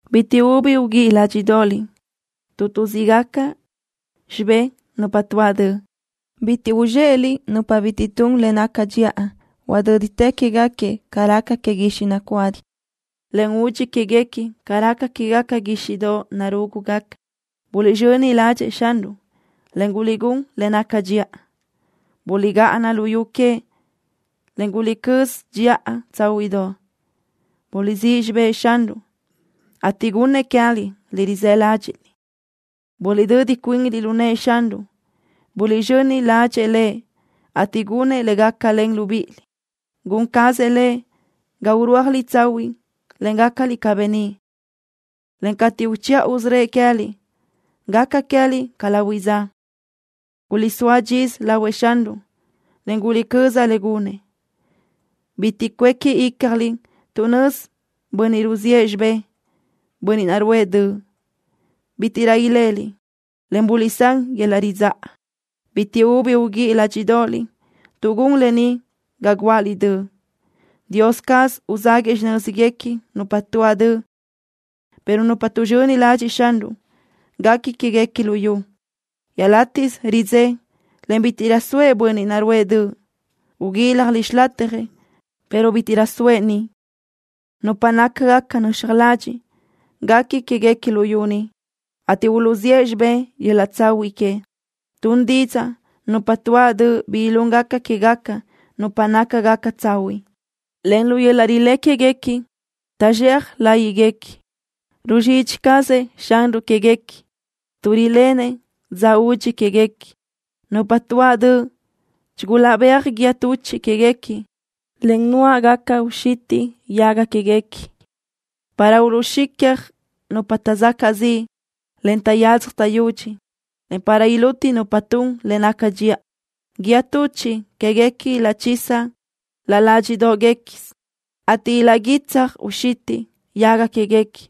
Bitiʼ ubi uguíʼi ládxiʼdoʼoliʼ tuʼ tuʼzíʼgaca xibé nupa tuáʼ döʼ. Bitiʼ uzxéʼeliʼ nupa bitiʼ tun le naca dxiʼa. Huadö́ditë quéguequi ca raca que guixiʼ nacuadi, en udxi quéguequi ca raca quégaca guíxiʼdoʼ narúgugaca. Buliʼzxöni ládxëʼë Xanruʼ, en guliʼgún le naca dxiʼa. Buliʼgáʼana luyú queëʼ, en guliʼcö́z dxiʼa tsáhuiʼdoʼ. Buliʼsíʼ xibë́ʼ Xanruʼ, ateʼ gunnëʼ queë́liʼ le rizë́ ládxiʼliʼ. Buliʼdödi cuinliʼ lu nëʼë Xanruʼ. Buliʼzxöni ládxëʼë Lëʼ, ateʼ gunëʼ le gácalen libíʼiliʼ. Gun cazëʼ Lëʼ ga urúajliʼ tsahuiʼ, en gácaliʼ ca beníʼ, en cateʼ uchiʼa usörö́ëʼ queë́liʼ, gaca queë́liʼ ca lahuiʼ dza. Guliʼsóa dxisö lahuëʼ Xanruʼ, en guliʼcöza le gunëʼ. Bitiʼ cuéqui ícjaliʼ tuʼ nözi bönniʼ ruziʼë xibé, bönniʼ naʼ ruʼë döʼ. Bítiʼrö leliʼ, en buliʼsán yöl-laʼ ridzáʼa. Bitiʼ ubi uguíʼi ládxiʼdoʼoliʼ tuʼ gun lë ni ga guáʼaliʼ döʼ. Dios caz uzáguëʼë xinö́zguequi nupa tuáʼ döʼ, pero nupa tuʼzxöni ladxiʼ Xanruʼ, guequi quéguequi luyú. Iaʼlátiʼsö xidzé, en bítiʼrö soëʼ bönniʼ naʼ ruʼë döʼ. Uguíljaliʼ xilatjëʼ, pero bítiʼrö soëʼ niʼ. Nupa nácagaca nöxaj ladxiʼ, guequi quéguequi luyú, ateʼ uluʼzíʼ xibé yöl-laʼ tsahuiʼ que. Tun didzaʼ nupa tuáʼ döʼ bi ilúngaca quégaca nupa nácagaca tsahuiʼ, en lu yöl-laʼ rilé quéguequi tagu zxea láyiʼguequi. Ruzxidxi cazëʼ Xanruʼ quéguequi, tuʼ riléʼenëʼ dza udxi quéguequi. Nupa tuáʼ döʼ chigulaʼbéaj guíë tuchiʼ quéguequi, en nuáʼgaca uxitiʼ yaga quéguequi para uluʼxicja nupa taʼzacaʼ ziʼ, en taʼyadzaj taʼyudxi, en para iluti nupa tun le naca dxiʼa. Guíë tuchiʼ quéguequi ilaʼchiza laʼ ládxiʼdoʼguequisö, ateʼ ilaʼguítsaj uxitiʼ yaga quéguequi.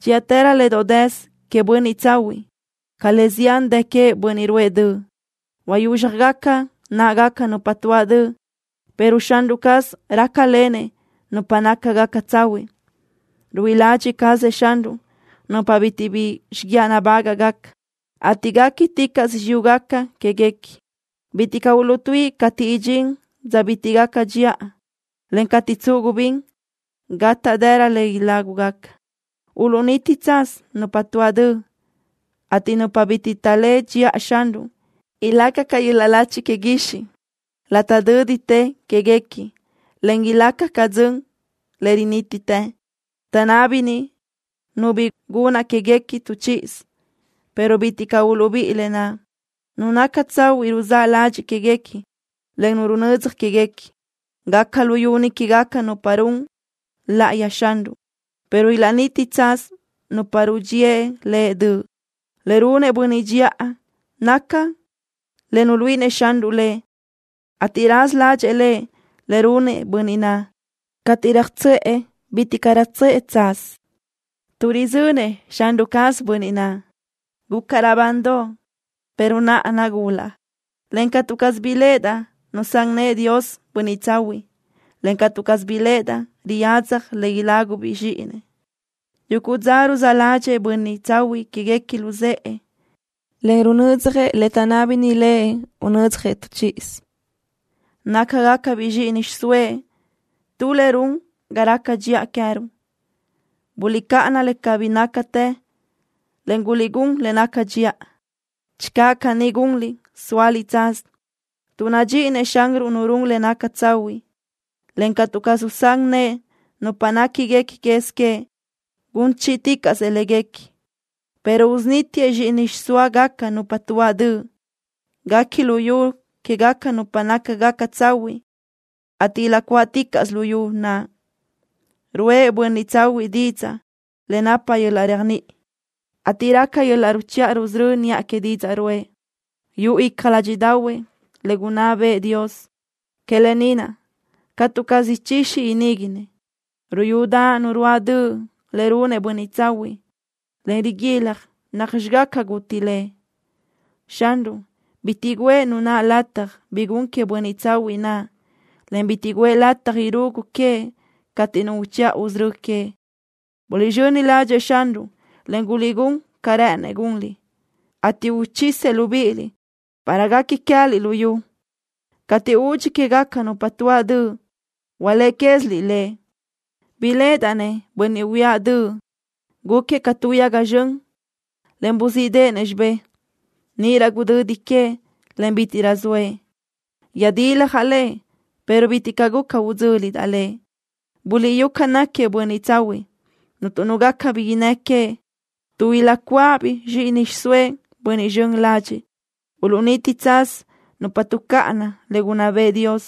Dxíʼatërö le doʼ dësö queëʼ bönniʼ tsahuiʼ ca le zián dë queëʼ bönniʼ ruʼë döʼ. Huayúzxjagaca náʼagaca nupa tuáʼ döʼ, pero Xanruʼ caz rácalenëʼ nupa nácagaca tsahuiʼ. Ruíʼi ladxiʼ cazëʼ Xanruʼ nupa bitiʼ bi xiguiaʼ nabágaʼgaca, ateʼ guéquiticaʼsö xiyúgaca quéguequi. Bitiʼ caʼ uluʼtuíʼi cateʼ idxín dza bitiʼ gaca dxiʼa, en cateʼ tsuʼu gubín, gátaʼdëra le ilágugaca. Uluʼniti tsaz nupa tuáʼ döʼ, ateʼ nupa bitiʼ taʼléʼe dxiʼa Xanruʼ ilaca ca yöl-laʼ lachi que guixiʼ. Laʼ tö́ditë quéguequi, en ilaca ca dzön le rinítitë. Taʼnábini nu bi gunna quéguequi tu chíʼisö, pero bitiʼ caʼ uluʼbíʼi lë naʼ. Nu naca tsahuiʼ ruzá ladxiʼ quéguequi, en runödzaj quéguequi. Gaca luyú quégaca nupa run láʼayëʼ Xanruʼ, pero ilaʼniti tsaz nupa rudxíëʼ Lëʼ döʼ. Le runëʼ bönniʼ dxiʼa naca le nuluíʼinëʼ Xanruʼ lëʼ, ateʼ raza ládxëʼë Lëʼ le runëʼ bönniʼ naʼ. Cateʼ röjtsöʼë, bitiʼ caʼ röjtsöʼë tsaz, tuʼ röjzönëʼ Xanruʼ caz bönniʼ naʼ. Gucaʼ raʼbandoʼ, pero naʼa nagulaʼ, en catu caz biléʼedaʼ nusán nëʼë Dios bönniʼ tsahuiʼ, en catu caz biléʼedaʼ riyadzaj le ilágubiʼ zxíʼinëʼ. Yuguʼ dza ruzáʼ ládxëʼë bönniʼ tsahuiʼ quéguequi luzë́ʼë en runödzjëʼ le taʼnábini lëʼ unödzjëʼ tu chíʼisö, Nácagacabiʼ zxíʼini xiʼsóëʼ tu le run ga raca dxiʼa queë́ruʼ. Buliʼcáʼana le cabí nácatë, en guliʼgún le naca dxiʼa. Channö caní gunliʼ, sóaliʼ tsaz, tuʼ nadxíʼinëʼ Xanruʼ nu run le naca tsahuiʼ, en catu caz usán nëʼë nupa néquiguequi quez queëʼ. Gun chíʼiticaʼsëʼ léguequi, pero usunítiëʼ zxíʼini xiʼsóagaca nupa tuáʼ döʼ. Guequi luyú quégaca nupa nácagaca tsahuiʼ, ateʼ ilaʼcuáʼticaʼsö luyú naʼ. Ruʼë bönniʼ tsahuiʼ didzaʼ le napa yöl-laʼ réajniʼi, ateʼ raca yöl-laʼ ruchiʼa rusörö́ niʼa que didzaʼ naʼ ruʼë. Yuʼu icja ládxiʼdaʼahuëʼ le gunná bëʼë Dios. Que lë ni naʼ catu caz ichixi iníguinëʼ. Ruyudaʼ nu ruáʼ döʼ le runëʼ bönniʼ tsahuiʼ, en riguilaj nacxi gaca guti lëʼ. Xanruʼ bitiʼ guʼë nu naʼ lataj bi gun queëʼ bönniʼ tsahuiʼ naʼ, en bitiʼ guʼë lataj irugu queëʼ cateʼ nu uchiʼa usörö́ queëʼ. Buliʼzxöni ládxëʼë Xanruʼ, en guliʼgún ca rë́ʼënëʼ gunliʼ, ateʼ uchisëʼ libíʼiliʼ para guequi queë́liʼ luyú. Cateʼ udxi quégaca nupa tuáʼ döʼ, hualéʼe quéziliʼ le. Biléʼedaʼ-nëʼ bönniʼ huíaʼ döʼ. Gúquiëʼ ca tu yaga zxön, en buzíʼdeʼenëʼ xibé. Níʼirö gudödi queëʼ, en bítiʼrö zoëʼ. Yöjdiljaʼ lëʼ, pero bitiʼ caʼ guca udzö́lidaʼ lëʼ. Buliʼyú ca náquiëʼ bönniʼ tsahuiʼ. Cuntu nu gaca bi innë́ queëʼ, tuʼ ilaʼcuáʼabiʼ zxíʼini xiʼsóëʼ bönniʼ zxön ladxiʼ. Uluʼniti tsaz nupa tuʼcáʼana le gunná bëʼë Dios.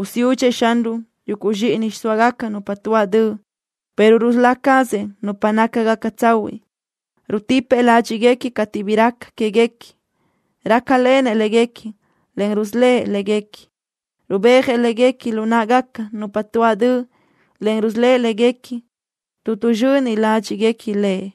Usiúdxëʼ Xanruʼ yuguʼ zxíʼini xiʼsóagaca nupa tuáʼ döʼ, pero rusölá cazëʼ nupa nácagaca tsahuiʼ. Rutipëʼ ládxiʼguequi cateʼ bi raca quéguequi. Rácalenëʼ léguequi, en rusölë́ʼ léguequi. Rubéajëʼ léguequi lu náʼagaca nupa tuáʼ döʼ, en rusölë́ʼ léguequi, tuʼ tuʼzxöni ládxiʼguequi Lëʼ.